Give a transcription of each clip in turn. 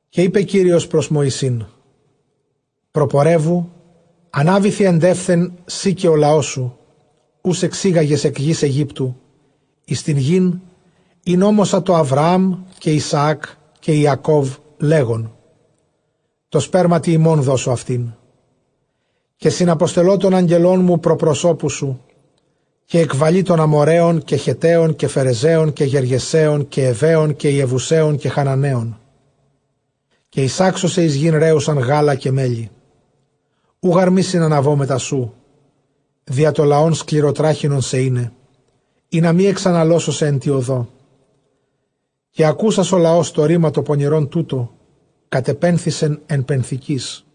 Καὶ εἶπε Κύριος πρὸς Μωυσῆς, προπορεύου, ἀνάβηθι ἐντεῦθεν σὺ καὶ ὁ λαός σου, οὓς ἐξήγαγες ἐκ γῆς Αἰγύπτου, εἰς τὴν γῆν, ἣν ὤμοσα τῷ Ἀβραὰμ, καὶ Ἰσαὰκ, καὶ Ἰακὼβ, λέγων, Τῷ σπέρματι ὑμῶν δώσω αὐτήν. Καὶ συναποστελῶ τὸν ἄγγελόν μου πρὸ προσώπου σου· καὶ ἐκβαλεῖ τὸν Ἀμοῤῥαῖον, καὶ Χετταῖον, καὶ Φερεζαῖον, καὶ Γεργεσαῖον, καὶ Εὐαῖον, καὶ Ἰεβουσαῖον, καὶ Χαναναῖον. Καὶ εἰσάξω σε εἰς γῆν ῥέουσαν γάλα καὶ μέλι· οὐ γὰρ μὴ συναναβῶ μετὰ σου, διὰ τὸ λαὸν σκληροτράχηλόν σε εἶναι, ἵνα μὴ ἐξαναλώσω σεε ἐν τῇ ὁδῷ. Καὶ ἀκούσας ὁ λαὸς τὸ ῥῆμα τὸ πονηρὸν τοῦτο, κατεπένθησεν ἐν πενθικοῖς.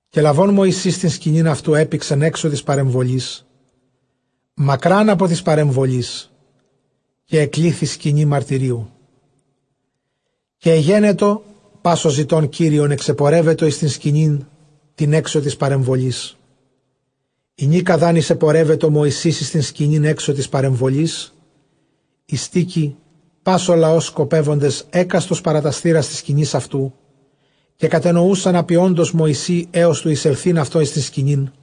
Καὶ λαβὼν Μωυσῆς τὴν σκηνὴν αὐτοῦ, ἔπηξεν ἔξω τῆς παρεμβολῆς, μακρὰν ἀπὸ τῆς παρεμβολῆς· καὶ ἐκλήθν Σκηνὴ μαρτυρίου· καὶ ἐγένετο, πᾶς ὁ ζητῶν Κύριον ἐξεπορεύετο εἰς τὴν σκηνὴν τὴν ἔξω τῆς παρεμβολῆς. Ἡνίκα δʼ ἂν εἰσεπορεύετο Μωυσῆς εἰς τὴν σκηνὴν ἔξω τῆς παρεμβολῆς, εἱστήκει πᾶς ὁ λαὸς σκοπεύοντες ἕκαστος παρὰ τὰς θύρας τῆς σκηνῆς αὐτοῦ· καὶ κατενοοῦσαν ἀπιόντος Μωυσῆ ἕως τοῦ εἰσελθεῖν αὐτὸν εἰς τὴν σκηνὴν.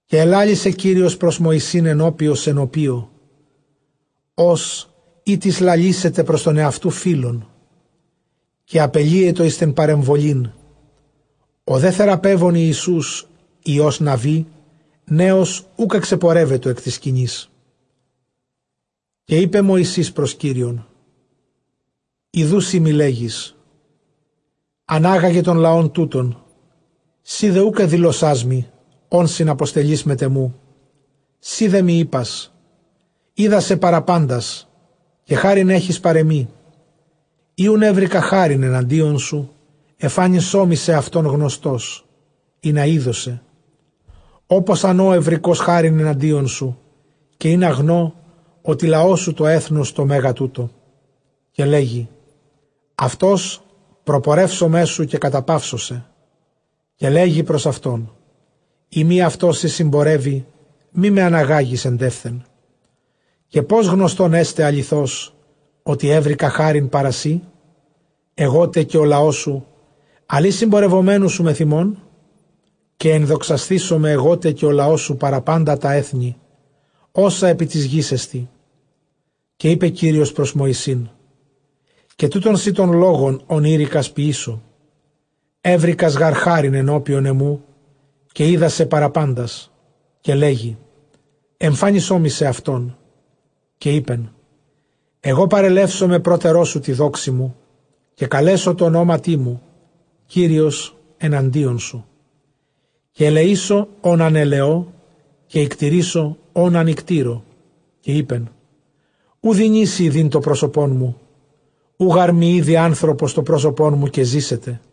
Καὶ ἐλάλησε Κύριος πρὸς Μωυσῆν, ἐνώπιος ἐνωπίῳ, ὡς εἴτις λαλήσει πρὸς τὸν ἑαυτοῦ φίλον· καὶ ἀπελύετο εἰς τὴν παρεμβολήν· ὁ δὲ θεράπων Ἰησοῦς υἱὸς Ναυὴ νέος οὐκ ἐξεπορεύετο ἐκ τῆς σκηνῆς. Καὶ εἶπε Μωυσῆς, πρὸς Κύριον, Ἰδοὺ σύ μοι λέγεις, ἀνάγαγε τὸν λαὸν τοῦτον, σὺ δὲ οὐκ ἐδήλωσάς μοι, ὃν συναποστελεῖς μετʼ ἐμοῦ· σὺ δέ μοι εἶπας, Οἶδά σε παρὰ πάντας, καὶ χάριν ἔχεις παρʼ ἐμοί. Εἰ οὖν εὕρηκα χάριν ἐναντίον σου, ἐμφάνισόν μοι σεαυτόν· γνωστῶς ἴδω ἴδω σε, ὅπως ἂν ὦ εὑρηκὼς χάριν ἐναντίον σου,, καὶ ἵνα γνῶ, ὅτι λαός σου τὸ ἔθνος τὸ μέγα τοῦτο. Καὶ λέγει, αὐτὸς προπορεύσομαί σου, καὶ καταπαύσω σε. Καὶ λέγει πρὸς αὐτόν, εἰ μὴ αὐτὸς σὺ σνμπορεύῃ, μή με ἀναγάγῃς ἐντεῦθεν. Καὶ πῶς γνωστὸν ἔσται ἀληθῶς, ὅτι εὕρηκα χάριν παρὰ σοί ἐγώ τε καὶ ὁ λαός σου, ἀλλʼ ἢ συμπορευομένου σου μεθʼ ἡμῶν; καὶ ἐνδοξασθήσομαι ἐγώ τε καὶ ὁ λαός σου παρὰ πάντα τὰ ἔθνη, ὅσα ἐπὶ τῆς γῆς ἐστί. Καὶ εἶπε Κύριος πρὸς Μωυσῆν, Καὶ τοῦτόν σοι τὸν λόγον, ὃν εἴρηκας ποιήσω· εὕρηκας, ποιήσω· εὕρηκας γὰρ χάριν ἐνώπιον ἐμοῦ, καὶ οἶδά σε παρὰ πάντας. Καὶ λέγει, ἐμφάνισόν μοι σεαυτόν. Καὶ εἶπεν, ἐγὼ παρελεύσομαι πρότερός σου τῇ δόξῃ μου, καὶ καλέσω τῷ ὀνόματί μου, Κύριος ἐναντίον σου· καὶ ἐλεήσω, ὃν ἂν ἐλεῶ, καὶ οἰκτειρήσω, ὃν ἂν οἰκτείρῶ. Καὶ εἶπε, οὐ δυνήσῃ ἰδεῖν τὸ πρόσωπόν μου· οὐ γὰρ μὴ ἴδῃ ἄνθρωπος τὸ πρόσωπόν μου, καὶ ζήσεται.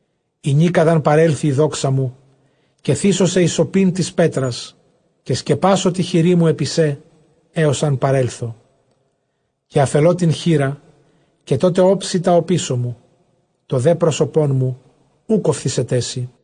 Ἡνίκα δʼ ἂν παρέλθηνᾑ ᾑ δόξα μου, καί θήσω σε εἰς ὀπὴν τῆς πέτρας, καὶ σκεπάσω τῇ χειρί μου ἐπὶ σὲ, ἕως ἂν παρέλθω. Καὶ ἀφελῶ τὴν χεῖρα, καὶ τότε ὄψει τὰ ὀπίσω μου· τὸ δὲ πρόσωπόν μου οὐκ ὀφθήσεταί σοι.